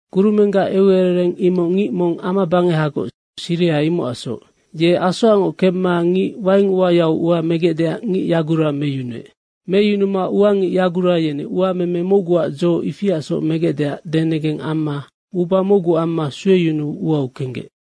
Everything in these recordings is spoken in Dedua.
“Kurumenggac eucerereng imoc ngic mong amabangehagoc, siriha imocacsoc. Ye asoacngoc kemma ngic waing uayau ua megecdeac ngic yagura meyunuec. Meyunuma ua ngic yagura yeni uameme mocguac dzo ifiasoc megecdeac denegeng amma uba mocgu amma sueyunuu uau kenggec.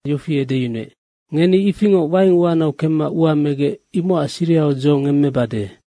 yofi edeyunuec, ‘Ngeni ifingoc waing uanau kemma ua megec, imocac sirihau dzo ngemmebade.’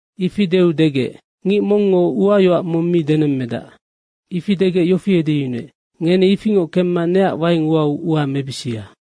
Ifi deu degec, ‘Ngic mongngo uayoac mong mi denemmedac.’ Ifi degec yofi edeyunuec, ‘Ngeni ifingoc kemma neac waing uau ua mebisia.’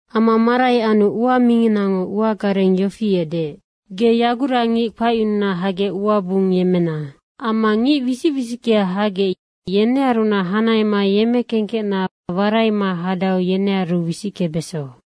Ama marai anu ua minginango ua gareng yofi edeec, ‘Ge yagurangic kpacyununa hagec uaac bung yemmena. Amma ngic wisic wisickea hagec, yenearunac hanahema yemmekengkecna waraima hadau, yenearu wisickebeso.’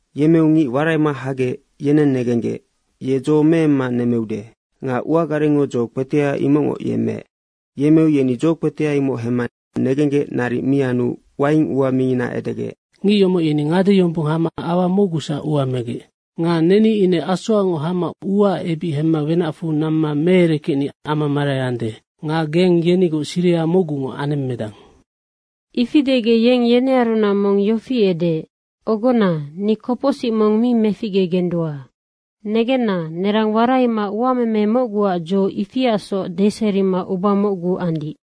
Yemmeu ngic waraima hagec yeneng negenggec, ‘Ye dzo meemma nemmeude.’ Nga ua garengngo dzo kpetea imocngoc yemmeec. Yemmeu yeni dzo kpetea imoc hemma negenggec naric mi anu waing ua mingina edegec, ‘Ngic yomoc yeni ngade yombong hama aua mocgusac ua megec. Nga neni ine asoacngoc hama uaac ebic hemma wenacfu namma meerekecni ama marai ande. Nga geng yenigoc siriha mocgungoc anemmedang.’ Ifi degec yeng yenearunac mong yofi edeec, ‘Ogona, ni kopocsic mong mi meficgegendua. Negenna, nerang waraima uameme mocguac dzo ifiasoc deserima uba mocgu andic.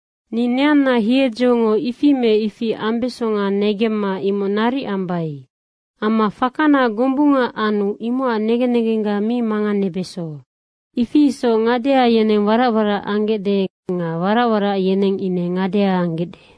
Ni neanna hiedzongo ifi me ifi ambesonga negemma imoc naric ambai. Amma fakana gombunga anu imocac negen negengga mi manganebeso.’ Ifi isoc ngadea yeneng warac warac anggecde nga warac warac yeneng ine ngadea anggecde.”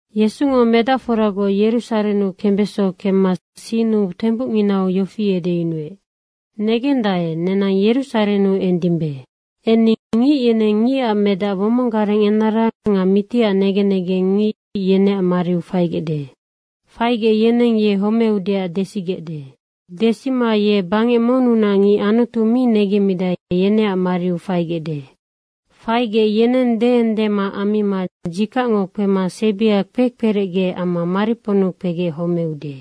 Yesungo medacforagoc Yerusarennu kembeso kemma sinnu tembucnginau yofi edeyunuec, “Negendae, nenang Yerusarennu endimbe. Enni ngic yeneng Ngicac Medac womong gareng enara nga mitiac negen negengngic, yeneac mariu faigecde. Faigec yeneng ye homeudeac desigecde. Desima ye bangec monnunac ngic Anutu mi negemmidae, yeneac mariu faigecde. Faigec yeneng deendema ammima dzikacngo kpema sebia kpekperecge amma mariponnu kpegec homeude.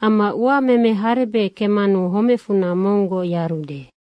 Amma uameme harebec kemmanu homecfunac monggoc yarude.”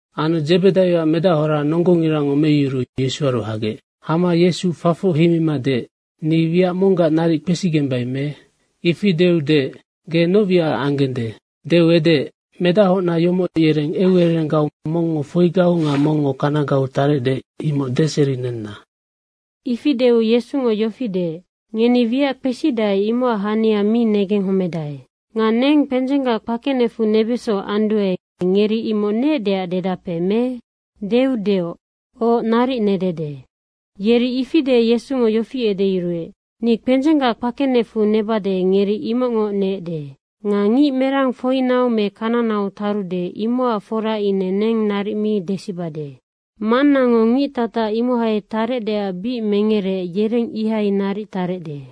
Anu Dzebedaioac medahora nonggongirango meyuruu Yesuaru hagec. Hama Yesu fafoc heimima deec, “Ni wiac monggac naric kpesigembai me?” Ifi deu deec, “Ge noc wiacac anggende?” Deu edeec, “Medachocna yomoc yereng eucererenggau mongngo foigau nga mongngo kanagau tarecde, imoc deserinenna.” Ifi deu Yesungo yofi deec, “Ngeni wiac kpesidae, imocac hania mi negenghomedae. Nga neng kpendzenggac kpakenecfu nebeso anduae, ngeri imoc neecdeac dedape me?” deu deoc, “Oc, naric nedede.” Yeri ifi deec Yesungo yofi edeyuruec, “Ni kpendzenggac kpakenecfu nebade, ngeri imocngoc neecde. Nga ngic merang foinau me kananau tarude, imocac fora ine neng naric mi desibade. Mannango ngic tatac imohai tarecdeac bic mengereec, yereng ihai naric tarecde.”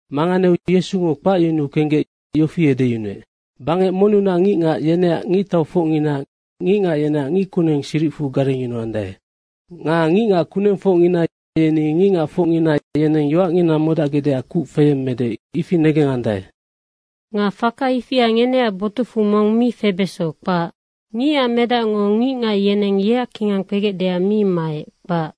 Manganeu Yesungo kpacyunuu kenggec yofi edeyunuec, “Bangec monnunac ngicngac, yeneac ngictaufocngina ngicngac yeneac ngickuneng siricfu garengyunuandae. Nga ngicngac kunengfocngina yeni ngicngacfocngina yeneng yoacngina modacgecdeac kuc feyemmede, ifinoc negengandae. Nga faka ifia ngeneac botucfu mong mi febeso, kpac. Ngicac Medacngo ngicngac yeneng yeac kingang kpegecdeac mi maec, kpac.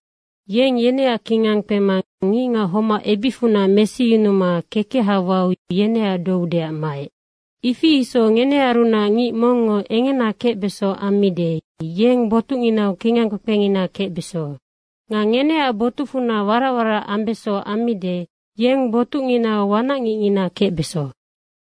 Yeng yeneac kingang kpema ngicngac homac ebicfunac yungecyunuma kekeha wau yeneac doudeac maec. Ifi isoc ngenearunac ngic mongngo engena kecbeso ammide, yeng botucnginau kingang kpekpengina kecbeso. Nga ngeneac botucfunac warac warac ambeso ammide, yeng botucnginau wanacngicngina kecbeso.”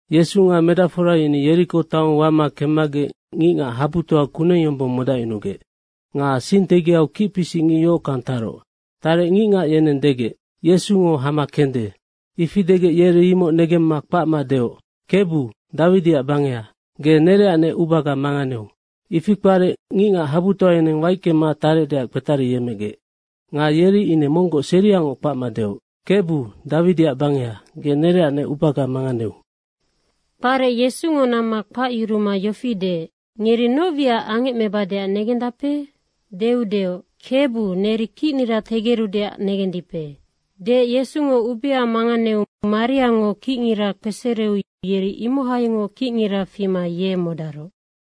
Yesu nga medacfora yeni Yeriko taong wama kemmagec ngicngac habutoa kuneng yombong modacyunugec. Nga sing tegiau kicpisic ngic yohockang taroc. Tarec ngicngac yeneng degec, “Yesungo hama kende.” ifi degec yeri imoc negemma kpacma deoc, “Kebu, Dawidiac bangeha, ge nereacnec ubaga manganeu.” Ifi kparec ngicngac habutoa yeneng waickema tarecdeac kpetariyecmegec. Nga yeri ine monggoc seriangoc kpacma deoc, “Kebu, Dawidiac bangeha, ge nereacnec ubaga manganeu.” Kparec Yesungo namma kpacyuruma yofi deec, “Ngeri noc wiac angecmebadeac negendape?” deu deoc, “Kebu, neri kicnira tegerudeac negendipe.” Deec Yesungo ubea manganeu mariango kicngira kpesereu yeri imohaingoc kicngira fima ye modaroc.